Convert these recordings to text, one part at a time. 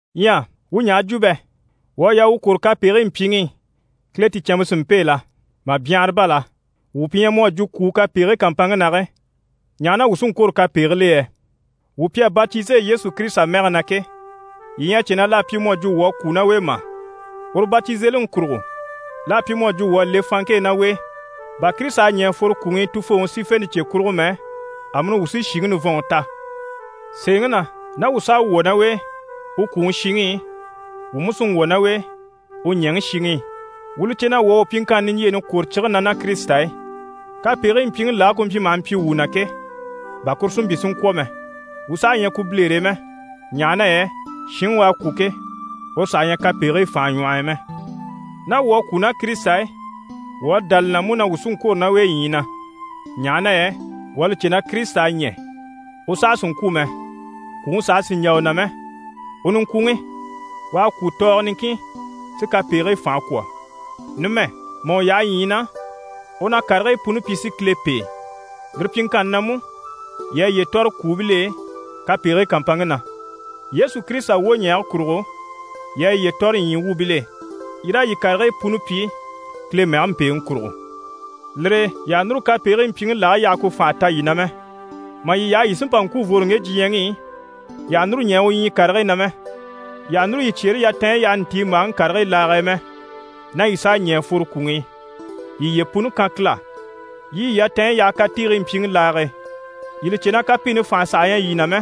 Ɲyɛ wuu ɲaha jwo bɛ? Wuu à yaa wuu kwôro kapegigii mpyiŋi i, Kile ticɛnmpe si mpêe la? Mà byanhara bá la! Wuu pi ɲyɛ mu à jwo kwùu, kapegigii kàmpanŋke na ke, ɲaha na wuu saha sí n‑kwôro kapegigil'e yɛ? Wuu mpii pi à batize Yesu Kirisita mɛge na ke, yii ɲyɛ a cè na l'à pyi mu à jwo wuu à kwû ná u e mà? Uru batizeliŋi kurugo, l'à pyi mu à jwo wuu à le fanŋke e ná u e, bà Kirisita à ɲɛ̀ a fworo kwùŋi i Tufooŋi sífente cye kurugo mɛ, amuni wuu sí shìŋi nivɔnŋi ta. Sèeŋi na, ná wuu s'à wwɔ̀ ná u e u kwùŋi shiŋi i, wuu mú sí n‑wwɔ̀ ná u e u ɲɛ̀ŋi shiŋi i. Wuu li cè na wuu à wuu pyiŋkanni niɲjyeeni kwòro cige na ná Kirisita e, kapegigii mpyiŋi lage ku mpyi maha mpyi wuu na ke, bà kuru si mpyi si ŋkwɔ̀ mɛ. Wuu saha ɲyɛ ku bilere e mɛ. Ɲaha na yɛ shinŋi u à kwû ke, uru saha ɲyɛ kapegigii fànhe ɲwɔh'i mɛ. Ná wuu à kwû ná Kirisita e, wuu à dá li na mú na wuu sí n‑kwôro ná u e ɲyii na. Ɲaha na yɛ wuu à li cè na Kirisita à ɲɛ̀, u saha sì n‑kwû mɛ, kwùŋi saha sì n‑jà u na mɛ. U niŋkwuŋi, u à kwû tɔɔgɔ niŋkin si kapegigii fànhe kwɔ̀. Numɛ, mà u yaha ɲyii na, u na karigii puni pyi si Kile pêe. Lire pyiŋkanni na mú, yii a yiye tɔ̀re kwùubil'e kapegigii kàmpanŋke na. Yesu Kirisita wwoɲɛɛge kurugo, yii a yiye tɔ̀re ɲyii wuubil'e, yii raa yii karigii puni pyi Kile mɛge mpèeŋi kurugo. Lire e yii àha núru kapegigii mpyiŋi lage yaha ku fànha ta yii na mɛ. Mà yii yaha yii sí n‑pa n‑kwû n‑fworo ŋge diɲyɛŋi i, yii àha núru ɲɛɛ u ɲyii karigii na mɛ. Yii àha núru yii cyeere yatanɲyi yaha ntiimbaaŋi karigii lage e mɛ. Ná yii s'à ɲɛ̀ mà fworo kwùŋi i, yii yiye puni kan Kile á. Yii yii yatanɲyi yaha katiigii mpyiŋi laage e. Yii li cè na kapiini fànhe saha ɲyɛ yii na mɛ,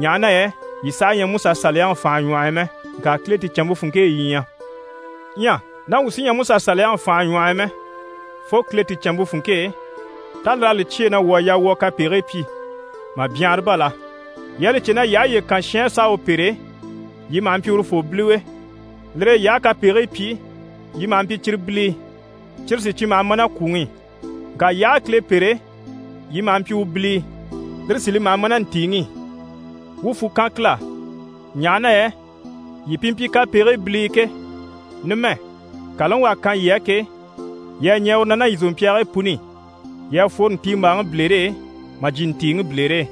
ɲaha na yɛ yii saha ɲyɛ MusaSaliyaŋi fànhe ɲwɔh'i mɛ, ŋka Kile ticɛnmpe funŋke e yii ɲyɛ. Ɲyɛ ná wuu sí ɲyɛ Musa Saliyaŋi fànhe ɲwɔh'i mɛ, fo Kile ticɛnmpe funŋke e, tá lir'à li cyêe na wuu à yaa wuu a kapegigii pyi? Mà byanhara bá la! Yii à li cè na yii aha yiye kan shin á s'a u pêre, yii maha mpyi urufoo biliwe. Lire e yii aha a kapegigii pyi, yii maha mpyi cyire bilii, cyire sí cyi maha ma ná kwùŋi i, ŋka yii aha a Kile pêre, yii maha mpyi u bilii, lire sí li maha ma ná ntìiŋi i. Wuu fwù kan Kile á, ɲaha na yɛ yii pi mpyi kapegigii bilii ke, numɛ, kàlaŋi u à kan yii á ke, yii à ɲɛɛ uru na ná yii zòmpyaagii puni i. Yii à fworo ntiimbaaŋi bilere e mà jyè ntìiŋi bilere e.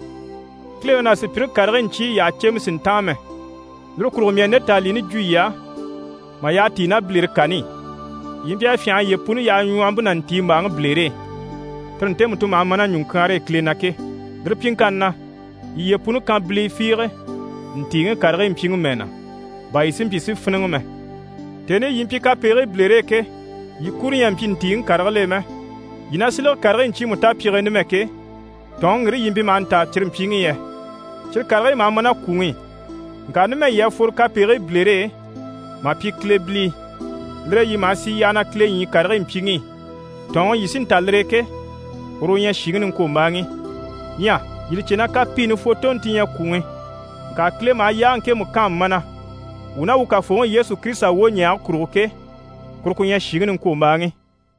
Kileŋi ná sùpyire karigii ɲcyii yyaha cèmɛ sì n‑táan mɛ, lire kurugo, mii à nde tàanlini jwo yii á mà yyaha tíi ná bilere kani i. Yii mpyi a fyânha a yiye puni yaha ɲwɔhɔmpe ná ntiimbaaŋi bilere e, tire ntemu ti maha ma ná ɲùŋkyaanre e Kile na ke. Lire pyiŋkanni na, yii yiye puni kan bilii fiige ntìiŋi karigii mpyiŋi mɛɛ na, bà yii si mpyi si fíniŋɛ mɛ. Tèni i yii mpyi kapegigii bilere e ke, yii kuro ɲyɛ a mpyi ntìiŋi karigil'e mɛ. Yii na silege karigii ɲcyiimu tapyige e numɛ ke, tɔ̀ɔnŋi ŋgire yii mpyi maha ntaa cyi mpyiŋi i yɛ? Cyire karigii maha ma ná kwùŋi i. Ŋka numɛ, yii à fworo kapegigii bilere e mà pyi Kile bilii. Lire e yii maha sì yyaha na Kile ɲyii karigii mpyiŋi i. Tɔ̀ɔnŋi yii sí n‑ta lire e ke, uru u ɲyɛ shìŋi niŋkwombaaŋi. Ɲyɛ yii li cè na kapiini fwotonte ti ɲyɛ kwùŋi. Ŋka Kile maha yaage ŋkemu kaan mana wuu ná wuu Kafooŋi Yesu Kirisita wwoɲɛɛge kurugo ke, kuru ku ɲyɛ shìŋi niŋkwombaaŋi.